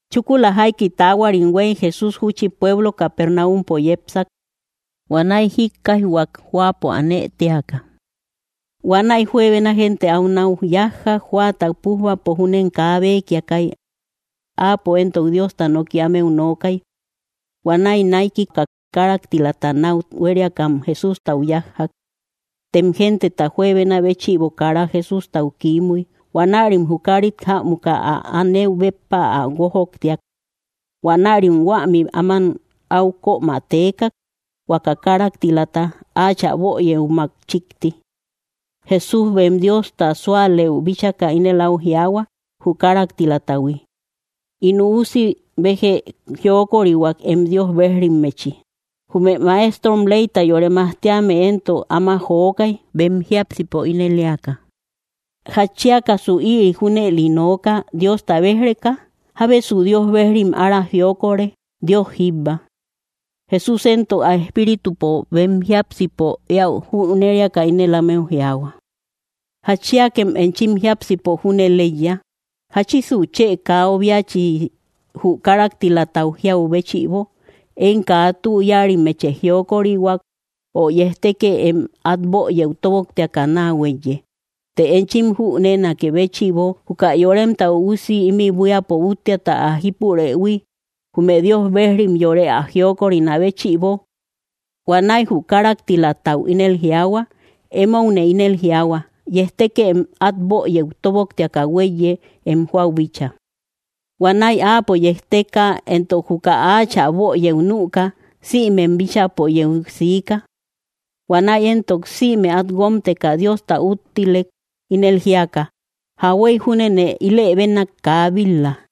Chúkula jaiki taahuarim huéy, Jesús júchi pueblo Capernáumpo yepsak. Huanäi jíkkaijhuak, jóapo anë téaka. Huanäi juebena gente áu nau yájjak. Jóata pújbapo júnem kaa békiakay. Áapo éntok Diosta noki ámeu nookay. Huanäi naikika káraktilata nau huériakam Jesústau yájjak. Tem genteta juebena béchïbo kara Jesústau kiimuy. Huanärim jü kárit jämuka ä anëbeu béppa ä guójoktiak. Huanärim huämi áman áu kömä teekak, huaka káraktilata, áachä böyëumak chíkti. Jesús bem Diosta súalëu bíchaka, ínel au jiaahua jü káraktilatahui: —In üusi, bejë jiokorihuak em Dios bejrimmechi. Jume maestrom leyta yore majtíame éntok áma jokay, bem jiápsipo ínel éaka: “¿Jatchiakasu ïri junëli nooka, Diosta béj‑reka? ¿Jábesu Dios bejrim ára jiokore? Dios jíbba.” Jesús éntok ä espíritupo bem jiápsipo éäu jüneriaka ínel ámeu jiaahua: —¿Jatchiakem enchim jiápsipo junëli eiya? ¿Jáchisu chë kaa obiachi jü káraktilatau jiau béchïbo: “Em kaa tü yáarimmechë jiokorihuak”; o, “Yejtekë em at böyëu tóboktiaka naa huéiye”? Të enchim jüneenakë béchïbo, juka Yoremta Üusi ímï buíapo úttiata ä jípurëhui, jume Dios bejrim yore ä jiokorinä béchïbo. Huanäi jü káraktilatau ínel jiaahua: —Emoune ínel jiaahua: Yejtekë em at böyëu tóboktiaka huéiye em jóau bíchaa. Huanäi áapo yejteka; entok, juka áachä böyëu nüka, sïmem bíchäpo yeu siika. Huanäi éntok sïme at guómteka Diosta úttilek, ínel jíaka: —Jauhuey júnete ílë bénak kaa bil-la.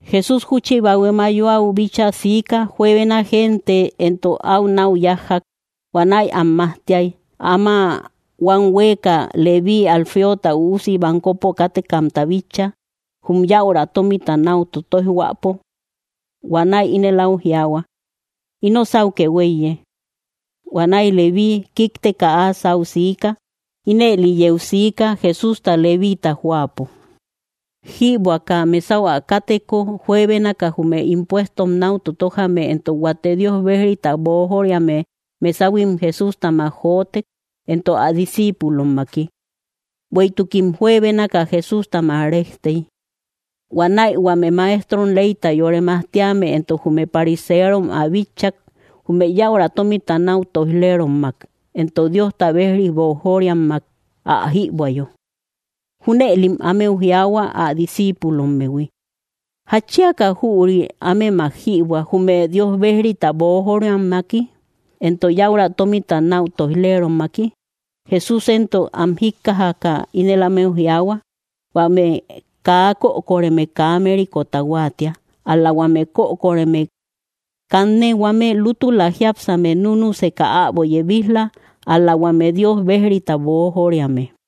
Jesús júchi bahue mayuau bíchaa siika. Juebena gente éntok áu náu yájjak. Huanäi am majtiay. Ama huam huéeka, Levíi, Alfeota üusi, bankopo kátekamta bitchak, jum yäura tómita nau totoijhuäpo. Huanäi ínel au jiaahua: —Ino sáukë huéiye. Huanäi Levíi kíkteka áa sáu siika. Ínëli yeu siika: Jesústa Levíita jóapo jïbuäka mesau ä káteko, juebénaka jume impuestom náu totojame entok huate Dios bejrita boojoriame mesahuim Jesústamak jotek, entok ä discíipulommaki. Bueïtukim juebénaka Jesústamak réjtey. Huanäi huame maestrom leyta yore majtíame entok jume pariseerom ä bitchak, jume yäura tómita nau toij‑lerommak entok Diosta bejri boojoriammak ä jïbuäyo. Júnëlim ámeu jiaahua, ä discíipulommehui: —¿Jatchiaka jüri ámemak jïbuä, jume Dios bejrita boojoriammaki, entok yäura tómita nau toij‑lerommaki? Jesús éntok am jíkkajaka, ínel ámeu jiaahua: —Huame kaa kökoreme kaa mérikota huáatia, ál‑la huame kökoreme. Kanne huame lútula jiápsame núnuseka äbo yebij‑la, ál‑la huame Dios bejrita boojoriame.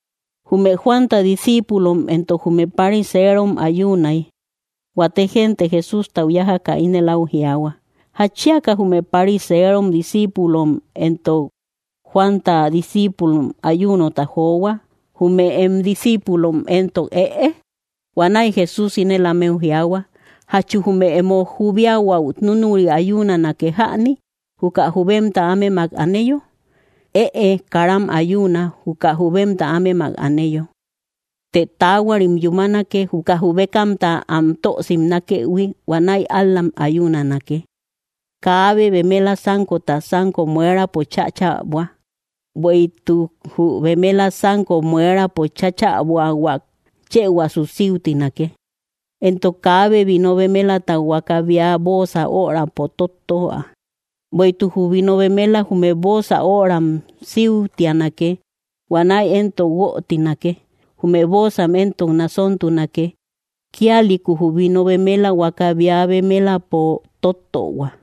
Jume Juanta discíipulom éntok jume pariserom ayuunay. Huate gente Jesústau yájaka ínel áu jiaahua: —¿Jatchiaka jume pariserom discíipulom éntok Juanta discíipulom ayuunota johua, jume em discíipulom éntok, ëe? Huanäi Jesús ínel ámeu jiaahua: —¿Jachu jume emo jubiahuau núnuri ayuunanake jäni, juka jubemta ámemak aneyo? Ëe; karam ayuuna, juka jubemta ámemak aneyo. Të taahuarim yúmanake, juka jubekamta am tö simnakëhui; huanäi ál‑lam ayuunanake. ’Kaabe bemela sánkota sanko muerapo cháchäbua, bueïtuk jü bemela sanko muerapo chäbuahuak, chëhuasu síutinake. Entok kaabe vino bemelata huaka bea bóosa örampo tóttöa, bueïtuk jü vino bemela jume bóosa öram síutianake. Huanäi éntok guötinake; jume bóosam éntok nasóntunake. Kíalïku jü vino bemela huaka bea bemelampo tóttöhua.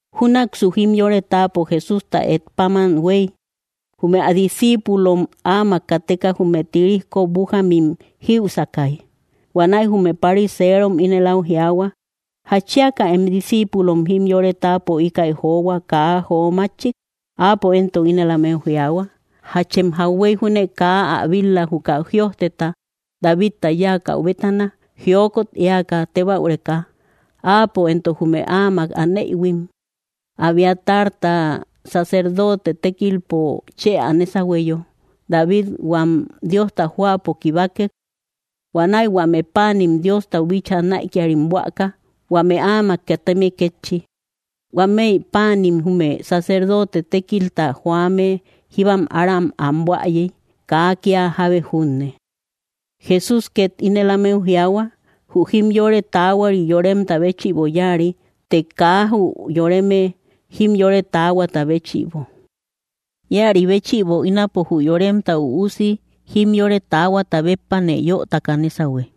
Júnaksu jimyore táapo Jesústa et páman huey, jume ä discíipulom áamak kateka jume tirijko bújamim jïusakay. Huanäi jume pariserom ínel au jiaahua: —¿Jatchiaka em discíipulom jimyore táapo íkäi johua, kaa jo mátchik? Áapo éntok ínel ámeu jiaahua: —¿Jáchem jauhuey júne kaa ä bit‑la, juka jïojteta Davita yáakäu bétana, jiokot éaka, tébäureka, áapo éntok jume áamak aneïhuim? Abiatarta sacerdoote tékilpo chë ä nésahueyo, David huam Diosta jóapo kibakek. Huanäi huame páanim Diostau bíchaa näikiarim buäka, huame áamak kateme kétchi. Huámëi páanim jume sacerdoote tékilta joame jíbam ára am buäyey, kaa kia jábe junne. Jesús két ínel ámeu jiaahua: —Jü jimyore taahuari yoremta béchïbo yáari; të kaa jü yoreme jimyore taahuata béchïbo. Íäri béchïbo ínapo, jü Yoremta Üusi jimyore taahuata béppane yötaka nésahue.